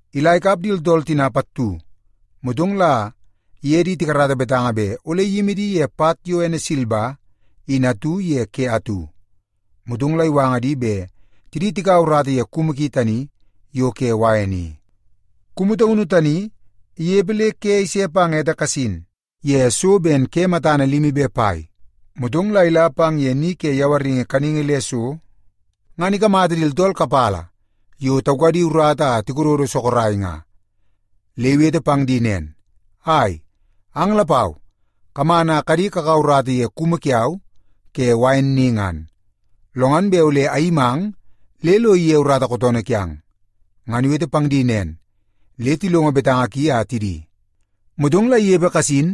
Ila ikap di tooltool tina pattu, motong la iye di tikarata betanga bet ole iyimi di ye pat yo ene silba in atu ye ke atu. Motong la iwanga di bet tidi tikaua urata ye kumu ki tani yo ke wain i. “Kumu taunu tani inepe le ke ise pang ete kasin ye so ben ke matana limi be pai, motong la ila pang ye ni ke yawaringi kaningi le so, ngan ikamata di tooltool kapala yo taukadi urata a tikododo sorok nga. Le nga iwete pang di nen, ‘Ai, ang lapau kaman a kadi kakaua urata ye kumu kiau ke wain ni ngan. Lo ngan bet ole ayimang le lo ige urata kootoonoo kiang.’ Ngan iwete pang di nen, le tilongo betanga ki a tidi. “Motong la inepe kasin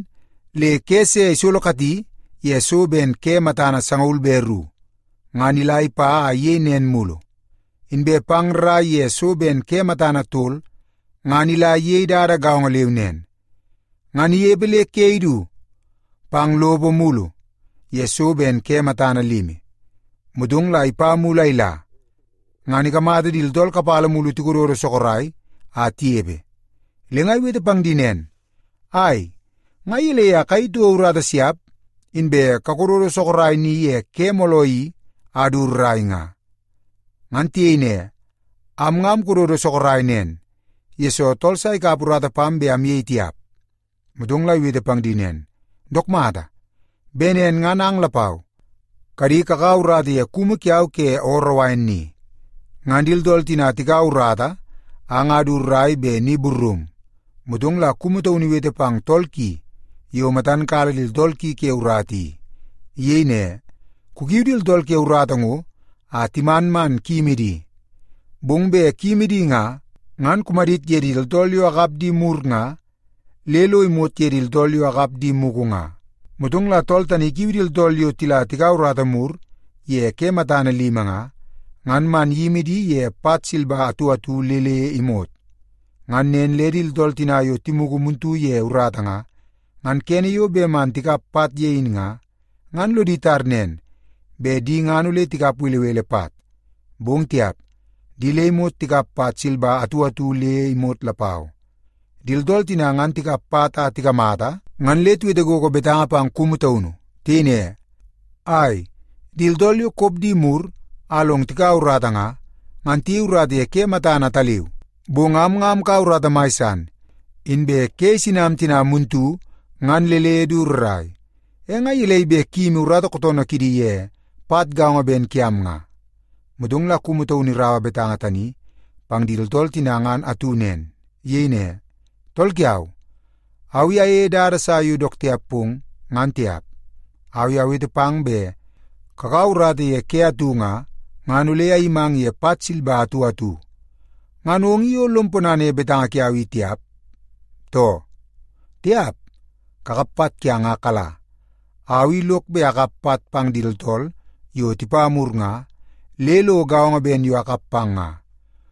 le ke se isolokati ye so ben ke matana sangaul be ru, ngan ila ipa a iyei nen mulu. Inbe pang rrai ye so ben ke matana tol, ngan ila iyei dada gaongo leu nen. Ngan inepe le ke idu pang lopo mulu ye so ben ke matana limi, motong la ipa mulu a ila, ngan ikamata di tooltool kapala mulu tikododo sorok a tinepe. Le nga iwete pang di nen, ‘Ai, nga gelei a kayei toko urata siap inbe kakodo sorok ni ye ke mooloo i a du rrai nga?’ “Ngan tiyei ne, ‘Am nga amkododo sorok nen, yesoo tool sa ikap urata pam bet amyei tiap.’ “Motong iwete pang di nen, ‘Dook mata! Bet nen ngan ang lapau kadi kakaua urata ye kumu kiau ke ooroo wain ni.’ “Ngan di tooltool tina tikaua urata a nga du rrai bet ni burrum, motong la kumu taunu iwete pang tool ki yo matan kala di tooltool ki ke urata i. Iyei ne, ‘Kukiu di tooltool ke urata ngo a timan man kuyimi di. Bong bet kuyimi di nga, ngan kumadit ye di tooltool yo akap di mur nga, le lo imot ye di tooltool yo akap di mugu nga.’ “Motong la tool tani ikiu di tooltool yo tila tikaua urata mur ye ke matana limi nga, ngan a man iyimi di ye pat silba atu atu le le imot. Ngan nen le di tooltool tina yo timugu muntu ye urata nga, ngan kene yo bet man tikap pat ye in nga, ngan lodi tar nen, bet di ngan ole tikap belebele pat. Bong tiap, di le imot tikap pat silba atu atu le imot lapau. Di tooltool tina ngan tikap pat a tikamata, ngan le tiwete gogo betanga pang kumu taunu. Tiyei ne, ‘Ai, di tooltool yo kop di mur a long tikaua urata nga, ngan tiyei urata ye ke matana ataleu. Bong am nga amkaua urata mai san, inbe ke isinam tina muntu ngan le le du rrai. E nga gelei bet kuyimi urata kootoonoo kidi ye pat gaongo ben kiam nga?’ “Motong la kumu taunu iraua betanga tani pang di tooltool tina ngan atu nen. Iyei ne, ‘Tool kiau, au i ayeie dada sa yo dook tiap pong, ngan tiap. Au i awete pang bet kakaua urata ye ke atu nga, ngan ole ayimang ye pat silba atu atu, ngan ong i o lom ponana ye betanga kiau i tiap, too? Tiap! Kakap pat kiang a kala. Au i lok bet akap pat pang di tooltool yo tipa mur nga, le lo gaongo ben yo akap pang nga.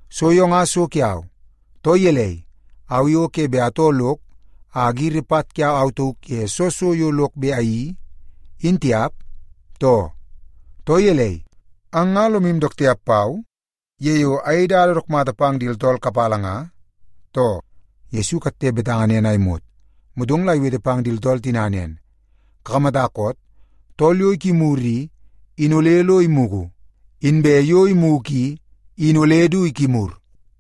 So yo nga so kiau. Too gelei, au i o ke bet atoo lok a agiri pat kiau au tauk ye soo so yo lok bet ayeii, in tiap, too? Too gelei, ang nga lomu dook tiap pau ye yo ayei dada dook mata pang di tooltool kapala nga, too?’” Yesu ikatte betanga nen a imot, motong la iwete pang di tooltool tina nen, “Kakamata koot? Tool yo ikimur i, in ole lo imugu, inbe yo imugu i, in ole du ikimur.”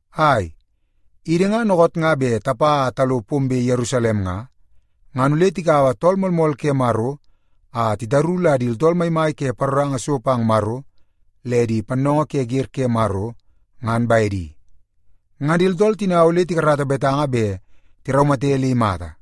“Ai, idi nga dookoot bet tapa a talo pombe Yerusalem nga, ngan ole tikaua Tool Moolmool ke Maro a titaru la di tooltool maimai ke paroranga so pang Maro le di pannoongoo ke wer ke Maro, ngan bedi. Ngan di tooltool tina ole tikarata betanga bet tiraumate le imata.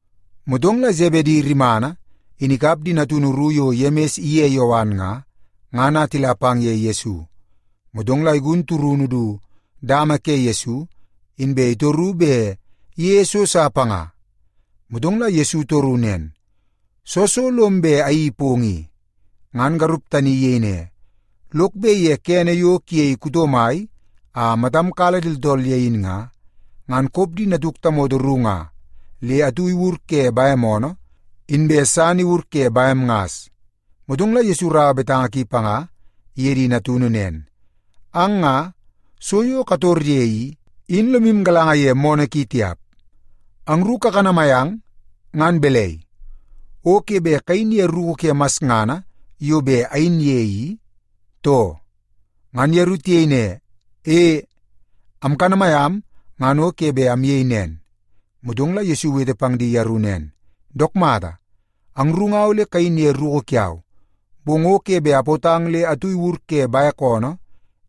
Motong la Sebedi rimana in ikap di natunu ru yo Yemis iye Yowan nga, ngan a tila pang ye Yesu. Motong la igun turunu du dama ke Yesu, inbe itoru bet iyeie so sa panga. Motong la Yesu itoru nen, “Soo so lom bet ayeii pong i?” Ngan garup tani iyei ne, “Lok bet ye kene yo kuyei kuto mai a matam kala di tooltool ye in nga, ngan kop di natuk tamoto ru nga le atu iwur ke bem oonoo, inbe san iwur ke bem ngas.” Motong la Yesu iraua betanga ki panga iye di natunu nen, “Ang nga, so yo kator ye i, in lomu galanga ye moonoo ki tiap. Angru kakanamai ang ngan balai, o ke bet kayin ye ruku ke masngana yo bet ayin ye i, too?” Ngan yeru tiyei ne, “E, amkanamai am ngan o ke bet amyei nen.” Motong la Yesu iwete pang di yeru nen, “Dook mata, angru nga ole kayin ye ruku kiau. Bong o ke bet apootang le atu iwur ke bek oonoo,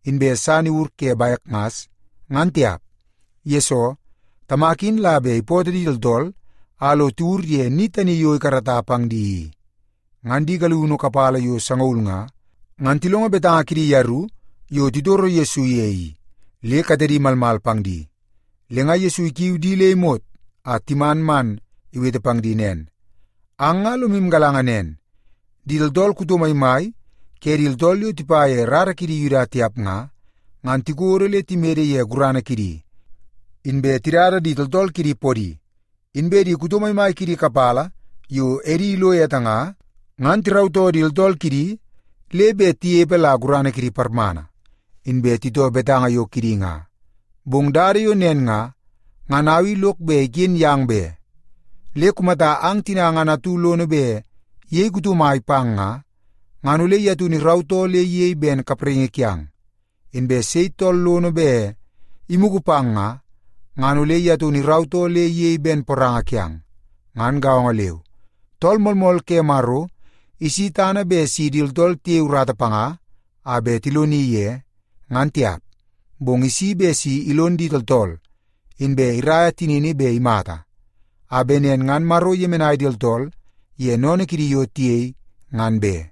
inbe san iwur ke bek ngas, ngan tiap. Yesoo, Tamak in la bet ipootoo di tooltool a lo tiwur ye ni tani yo ikarata pang di i.” Ngan di galiunu kapala yo sangaul nga, ngan tilongo betanga kidi yeru yo titoro Yesu ye i, le katedi malmal pang di. Le nga Yesu ikiu di le imot a timan man iwete pang di nen, “Ang nga lomu galanga nen, di tooltool kuto maimai ke di tooltool yo tipa ye rara kidi Yuda tiap nga, ngan tikodo le timede ye gurana kidi, inbe tidada di tooltool kidi podi. Inbe di kuto maimai kidi kapala yo edi ilo ete nga, ngan tirautoo di tooltool kidi le bet tinepe la gurana kidi parmana, inbe titoo betanga yo kidi nga. Bong dada yo nen nga, ngan au i lok bet iken yang be. Le kumata ang tina ngan atu lono bet iyei kuto mai pang nga, ngan ole ye taunu irautoo le iyei ben kapraingi kiang. Inbe sei tool lono bet imugu pang nga, ngan ole ye taunu irautoo le iyei ben poranga kiang. Ngan gaongo leu, Tool Moolmool ke Maro isi tana bet si di tooltool tiyei urata panga a bet tiloni ye, ngan tiap. Bong isi bet si ilon di tooltool, inbe iraia tinini bet imata, a bet nen ngan Maro iyemenai di tooltool ye sennene kidi yo tiyei, ngan be.”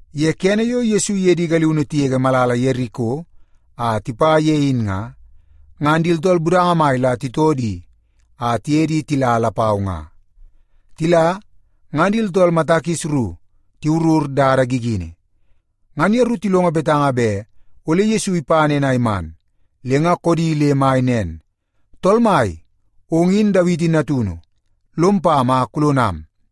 Ye kene yo Yesu iye di galiunu tigege malala Yeriko a tipa ye in nga, ngan di tooltool budanga mai la titoo di a tiye di tila lapau nga. Tila, ngan di tooltool mata kis ru tiwurur dada gigini. Ngan yeru tilongo betanga bet ole Yesu ipa nen a iman, le nga koodi le mai nen, “Tool Mai, ong in Dawiti natunu. Lom pam a kulonam!”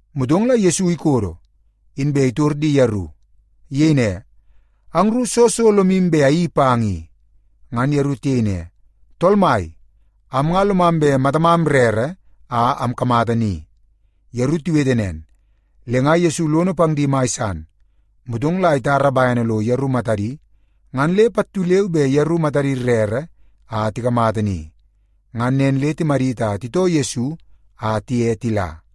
Motong la Yesu ikodo, inbe itor di yeru. Iyei ne, “Angru, soo so lomu bet ayeii pang i?” Ngan yeru tiyei ne, “Tool Mai, am nga lomam bet matamam rere a amkamata ni.” Yeru tiwete nen, le nga Yesu lono pang di mai san. Motong la itar bene lo yeru matadi, ngan le pattu leu be yeru matadi rere a tikamata ni. Ngan nen le timadit a titoo Yesu a tiye tila.